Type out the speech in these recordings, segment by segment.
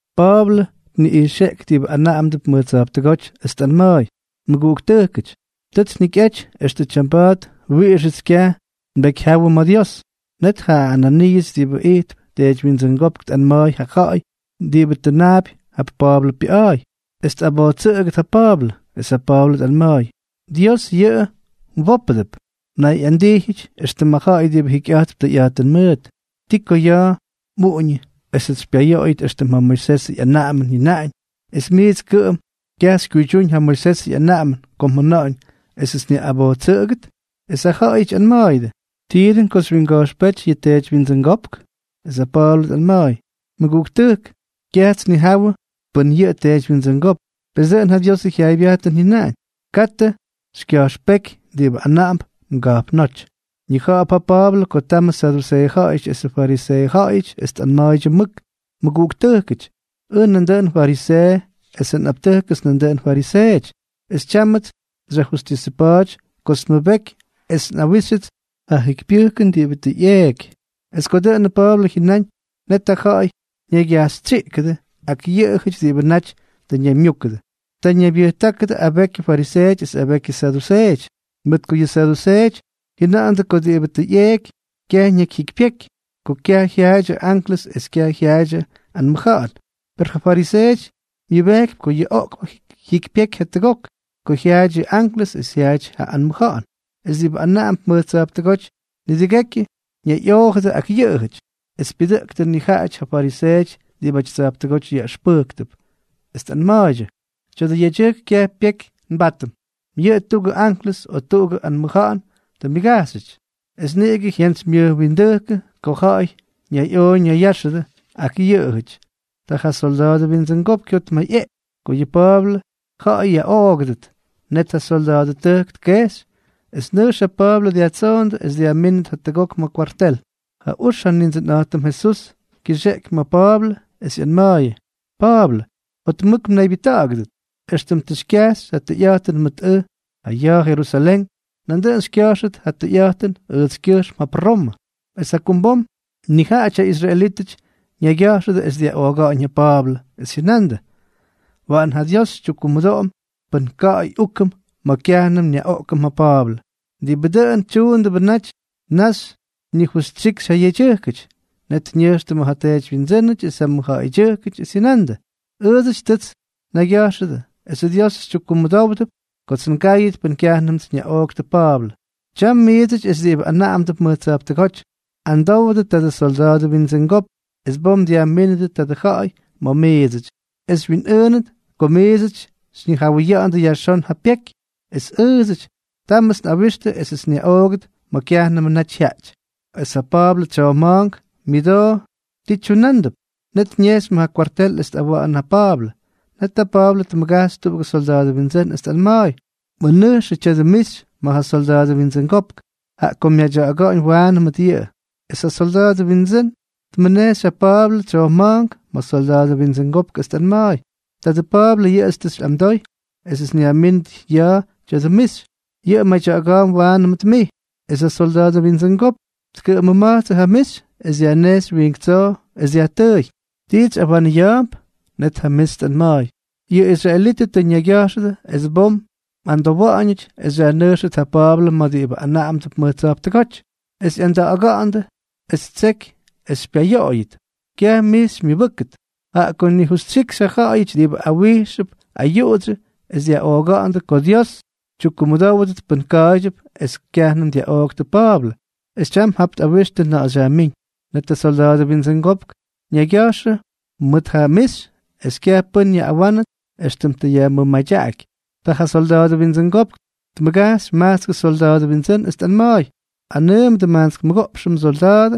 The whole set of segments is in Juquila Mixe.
Pa̱a̱blʉ tniꞌijxeꞌky diꞌibʉ anaꞌamdʉp mʉj tsa̱jptʉgóty, es tꞌanma̱a̱y: —Mʉguꞌuktʉjkʉty, tʉts njikyꞌaty extʉ tyamba̱a̱t wiꞌixʉts kyaj nbekyjyawʉ ma̱ ja Dios. Net ja Ananiiʉs diꞌibʉ ijtp teedywyindsʉngópk, tꞌanma̱a̱y ja ja̱ꞌa̱y diꞌibʉ tʉnaapy jap Pa̱a̱blʉ pyaꞌa̱a̱y es tꞌabojtsʉꞌʉgʉt ja Pa̱a̱blʉ. Es ja Pa̱a̱blʉ tꞌanma̱a̱y: —Dios yʉꞌʉ mwópʉdʉp, mnayꞌandijyʉty éxtʉmʉ ja̱ꞌa̱y diꞌibʉ jikyꞌa̱jtp tʉyꞌa̱jtʉn mʉʉt. ¿Ti ko ya̱a̱ mꞌuꞌuñʉ esʉts xypyayoꞌoyʉt éxtʉm ja Moisesʉ ꞌyanaꞌamʉn jyʉnaꞌañ, es mijts kʉꞌʉm kyaj xykyuydyúñ ja Moisesʉ ꞌyanaꞌamʉn ko mjʉna̱ꞌa̱ñ esʉts nyaꞌꞌabojtstsʉꞌʉgʉt? Es ja ja̱ꞌa̱yʉty ꞌyanma̱a̱yʉdʉ: —¿Tii dʉꞌʉn xywyinga̱jxpéty yʉ teedywyindsʉngópk? Es ja Pa̱a̱blʉ tꞌanma̱a̱y: —Mʉguꞌuktʉjk, kyajts nnija̱wʉ pʉn yʉꞌʉ teedywyindsʉngópk. Pes dʉꞌʉn ja Diosʉ jyaaybyajtʉn jyʉnaꞌañ: “Katʉ xykya̱jxpéky diꞌibʉ anaꞌamp mga̱jpnóty.” Ñija̱ꞌa̱p ja Pa̱a̱blʉ ko tamʉ saduseeʉ ja̱ꞌa̱yʉty esʉ fariseeʉ ja̱ꞌa̱yʉty, es tꞌanma̱a̱y mʉk: —Mʉguꞌuktʉjkʉty, ʉj nandʉꞌʉn fariseeʉ esʉ nꞌaptʉjkʉts nandʉꞌʉn fariseeʉty, es tyámʉts xyajjustisʉpa̱a̱ty kots nmʉbeky es nꞌawíxyʉts ja jyikypyʉjkʉn diꞌibʉ tʉ ꞌyeeky. Es ko dʉꞌʉnʉ Pa̱a̱blʉ jyʉnáñ, net ja ja̱ꞌa̱y ñaygyajxytsyiꞌkʉdʉ ak yʉꞌʉjʉty diꞌibʉ naty tʉ ñaymyúkʉdʉ, ta ñaybyʉjtákʉdʉ abekyʉ fariseeʉty es abekyʉ saduseeʉty, mʉt ko yʉ saduseeʉty jyʉna̱ꞌa̱ndʉ ko diꞌibʉ tʉ ꞌyeeky kyaj ñakyjyikypyeky, ko kyaj jyaadyʉ anklʉs es kyaj jyaadyʉ anmʉja̱ꞌa̱n. Per yʉ fariseeʉty myʉbejkypy ko yʉ oꞌkpʉ jyikypyeky jatʉgok, ko jyaaty yʉ anklʉs es jyaaty ja anmʉja̱ꞌa̱n. Es diꞌibʉ anaꞌamdʉp mʉj tsa̱jptʉgóty nidʉgekyʉ ñayꞌoojʉdʉ ak yʉꞌʉjʉty. Es pyʉdʉꞌktʉ nijaꞌajʉty ja fariseeʉty diꞌibʉty tsa̱jptʉgóty yaꞌʉxpʉjktʉp, es tꞌanma̱a̱ydyʉ: —Tya̱dʉ yedyʉjk kyaj pyeky nbátʉm. Yʉꞌʉ da tuꞌugʉ anklʉs o tuꞌugʉ anmʉja̱ꞌa̱n tʉ myʉgajxyʉty. Es niꞌigʉ jyantsymyʉjwindʉ́kʉ ko ja̱ꞌa̱y ñayꞌoo ñayya̱ꞌa̱xʉdʉ ak yʉꞌʉjʉty. Ta ja solda̱a̱dʉ windsʉngopk jyotmayꞌeꞌky ko yʉ Pa̱a̱blʉ ja̱ꞌa̱y yaꞌoogʉdʉt. Net ja syolda̱a̱dʉtʉjk tkejxy es nʉjx ja Pa̱a̱blʉ dyajtsoondʉ es dyajmínʉt jatʉgok ma̱ kwartel. Ja ux ja Nindsʉnꞌa̱jtʉm Jesús kyʉxeꞌky ma̱ Pa̱a̱blʉ, es ꞌyanma̱a̱yʉ: —Pa̱a̱blʉ, jotmʉk mnaybyʉjta̱ꞌa̱gʉdʉt. Extʉm tʉ xykyajxy ja tʉyꞌa̱jtʉn mʉt ʉj ja ya̱a̱ Jerusalén, nandʉꞌʉn xykya̱jxʉt ja tʉyꞌa̱jtʉn ʉjtskyʉjxm jap Romʉ. Es jakumbom nijaꞌajʉty ja israelítʉty ñaygya̱jxʉdʉ es dyaꞌooga̱ꞌa̱ñ ja Pa̱a̱blʉ, es jyʉnandʉ: —Waꞌan ja Dios xytyukkumʉdoꞌom pʉn ka̱ꞌa̱y úkʉm ma̱ kyajnʉm nyaꞌoꞌkʉm ja Pa̱a̱blʉ. Diꞌibʉ dʉꞌʉn tyunándʉbʉ naty naxy nijustyikxy ja yedyʉjkʉty. Net ñʉjxtʉ ma̱ ja teedywyindsʉ́nʉty es ja mʉjja̱ꞌa̱ydyʉjkʉty, es jyʉnandʉ: —Ʉʉdsʉty tʉts nnaygya̱jxʉdʉ es Diósʉts xytyukmʉdówdʉt kots ngáyʉt pʉn kyajnʉmts nyaꞌooktʉ Pa̱a̱blʉ. Tyam miidsʉty es diꞌibʉ anaꞌamdʉp mʉj tsa̱jptʉgóty, amdowdʉ tadʉ solda̱a̱dʉ windsʉngopk es bom dyajmínʉdʉ tadʉ ja̱ꞌa̱y ma̱ miidsʉty, es xywyinꞌʉʉnʉt ko miits xyñijawʉya̱ꞌa̱ndʉ yajxón ja pyeky. Es ʉʉdsʉty, támʉts nꞌawixtʉ esʉts nyaꞌoogʉt ma̱ kyajnʉmʉ naty jyaꞌty. Es ja Pa̱a̱blʉ ja tsyojma̱a̱nk myʉdoo ti tyunándʉp, net ñejxy ma̱ ja kwartel es tꞌawa̱ꞌa̱nʉ ja Pa̱a̱blʉ. Net ja Pa̱a̱blʉ tmʉgajxy tuꞌugʉ solda̱a̱dʉ windsʉ́n, es tꞌanma̱a̱y: —Mʉnʉjxʉ tya̱dʉ mixy ma̱ ja solda̱a̱dʉ windsʉngopk, jaꞌa ko myadya̱ꞌa̱ga̱ꞌa̱ñ waanʉ mʉt yʉꞌʉ. Es ja solda̱a̱dʉ windsʉ́n tmʉnejxy ja Pa̱a̱blʉ tsyojma̱a̱nk ma̱ solda̱a̱dʉ windsʉngopk, es tꞌanma̱a̱y: —Tadʉ Pa̱a̱blʉ yʉꞌʉts tʉ xyꞌamdoy esʉts nyajmínʉt ja ya̱a̱ tya̱dʉ mixy. Yʉꞌʉk madya̱ꞌa̱ga̱a̱mp waanʉ mʉt mij. Es ja solda̱a̱dʉ windsʉngopk tkʉꞌʉmʉma̱jtsʉ ja mixy, es dyajnejxy wiink tsoo, es dyajtʉʉy: —¿Tits xyꞌawanʉya̱a̱mp? Net ja mixy tꞌanma̱a̱y: —Yʉ israelítʉty tʉ ñaygya̱jxʉdʉ es bom mꞌamdowa̱ꞌa̱ñʉty es xyajnʉjxʉt ja Pa̱a̱blʉ ma̱ diꞌibʉ anaꞌamdʉp mʉj tsa̱jptʉgóty, es ꞌyanda̱ꞌa̱ga̱ꞌa̱ndʉ es ttseky es xypyayoꞌoyʉt. Kyaj mij xymyʉbʉ́kʉt, jaꞌa ko nijustyikxyñaxy ja jyaꞌayʉty diꞌibʉ awijxp ayuꞌudsyʉ, es tʉ jyʉna̱ꞌa̱ndʉ ko Dios tyukkumʉdówʉdʉt pʉn ka̱a̱ydyʉp es kyajnʉm dyaꞌooktʉ Pa̱a̱blʉ; es tyam tap tꞌawixtʉ na̱ꞌa̱ xyajmíñ. Net ja solda̱a̱dʉ windsʉngopk ñayjyʉga̱jxʉ mʉt ja mixy es kyaj pʉ́n yaꞌꞌawánʉt éxtʉm tʉ yajmʉmadyaꞌaky. Ta ja solda̱a̱dʉ windsʉngopk tmʉgajxy majtskʉ solda̱a̱dʉ windsʉ́n, es tꞌanma̱a̱y: —Anʉʉmʉdʉ majtsk mʉgoꞌpxʉ msolda̱a̱dʉ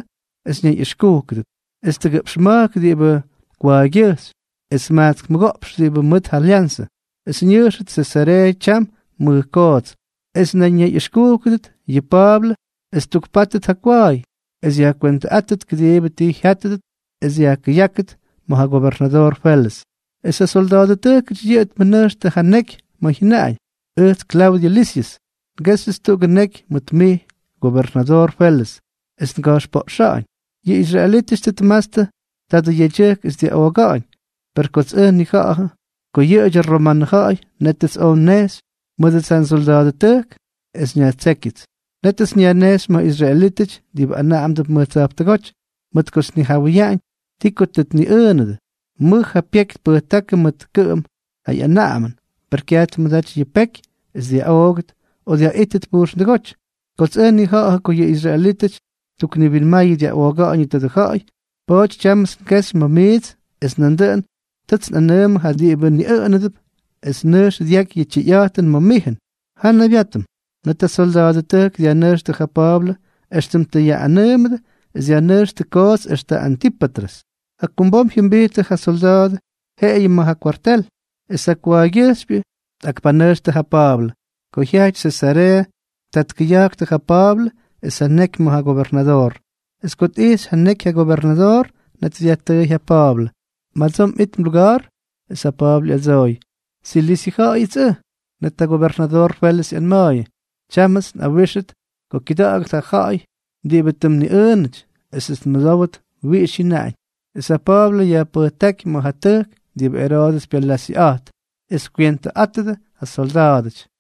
es ñayꞌʉxkúkʉdʉt, es tʉgʉꞌpx ma̱jk diꞌibʉ kwa̱a̱ygyʉjxy, es majtsk mʉgoꞌpxʉ diꞌibʉ mʉt ja lyanzʉ, es ñʉjxʉt Sesareeʉ tyam mʉj koots. Es nandʉꞌʉn ñayꞌʉxkúkʉdʉt yʉ Pa̱a̱blʉ es ttukpátʉt ja kwa̱a̱y, es yajkwentʉꞌáttʉt kʉdiibʉ ti jyátʉdʉt es yajkʉyákʉt ma̱ ja gobernadoor Felʉs. Es ja solda̱a̱dʉtʉjkʉty yʉꞌʉ tmʉnʉjxtʉ ja neky ma̱ jyʉnaꞌañ: “Ʉjts Klaudyʉ Lisyʉs, ngéxyʉts tuꞌugʉ neky mʉt mij, gobernadoor Felʉs, es nga̱jxpoꞌxa̱ꞌa̱ñ. Yʉ israelítʉty tʉ tmatstʉ tadʉ yedyʉjk es dyaꞌooga̱ꞌa̱ñ, per kots ʉj nnija̱ꞌa̱jʉ ko yʉꞌʉdyʉ romanʉ ja̱ꞌa̱y, nétʉts oj nnejxy mʉdʉts ja nsolda̱a̱dʉtʉjk es nyajtsékyʉts. Nétʉts nyajnejxy ma̱ israelítʉty diꞌibʉ anaꞌamdʉp mʉj tsa̱jptʉgóty, mʉt kots nnijawʉyaꞌañ ti ko tʉ tniꞌʉʉnʉdʉ. Mʉj ja pyeky tpʉjtákʉdʉ mʉt kʉꞌʉm ja ꞌyanaꞌamʉn; per kyaj tmʉdaty yʉ peky es dyaꞌoogʉt o dyaꞌítʉt pujxndʉgóty. Kots ʉj nnija̱ꞌa̱jʉ ko yʉ israelítʉty ttukniwinmayʉ dyaꞌooga̱ꞌa̱ñʉ tadʉ ja̱ꞌa̱y, pa̱a̱ty tyámʉts ngexy ma̱ mijts; es nandʉꞌʉn tʉts nꞌanʉʉmʉ ja diꞌibʉ niꞌʉꞌʉnʉp es nʉjx dyaky yʉ tyʉyꞌa̱jtʉn ma̱ mijʉn. Ja nnaybyátʉm.” Net ja solda̱a̱dʉtʉjk dyajnʉjxtʉ ja Pa̱a̱blʉ éxtʉm tʉ yaꞌꞌanʉʉmʉdʉ, es dyajnʉjxtʉ koots extʉ Antípatrʉs. Jakumbom jyʉmbijttʉ ja solda̱a̱dʉ yeꞌebyʉ ma̱ ja kwartel, es ja kwa̱a̱ygyʉjxypyʉ tꞌakpanʉjxtʉ ja Pa̱a̱blʉ. Ko jyajty Sesareeʉ, ta tkʉya̱jktʉ ja Pa̱a̱blʉ es ja neky ma̱ ja gobernadoor. Es ko tꞌijxy ja neky ja gobernadoor, net dyajtʉʉy ja Pa̱a̱blʉ: —¿Madsoo mꞌit mluga̱ar? Es ja Pa̱a̱blʉ ꞌyadsooy: —Silisyʉ ja̱ꞌa̱yʉts ʉj. Net ja gobernadoor Felʉs ꞌyanma̱a̱yʉ: —Tyámʉts nꞌawíxʉt ko kyʉda̱ꞌa̱gʉt ja ja̱ꞌa̱y diꞌibʉ tʉ mniꞌʉʉnʉty, esʉts nmʉdówʉt wiꞌix jyʉnaꞌañ. Es ja Pa̱a̱blʉ yajpʉjtáky ma̱ ja tʉjk diꞌibʉ Eroodʉs pyalasyʉꞌa̱jt, es kywentʉꞌátʉdʉ ja solda̱a̱dʉty.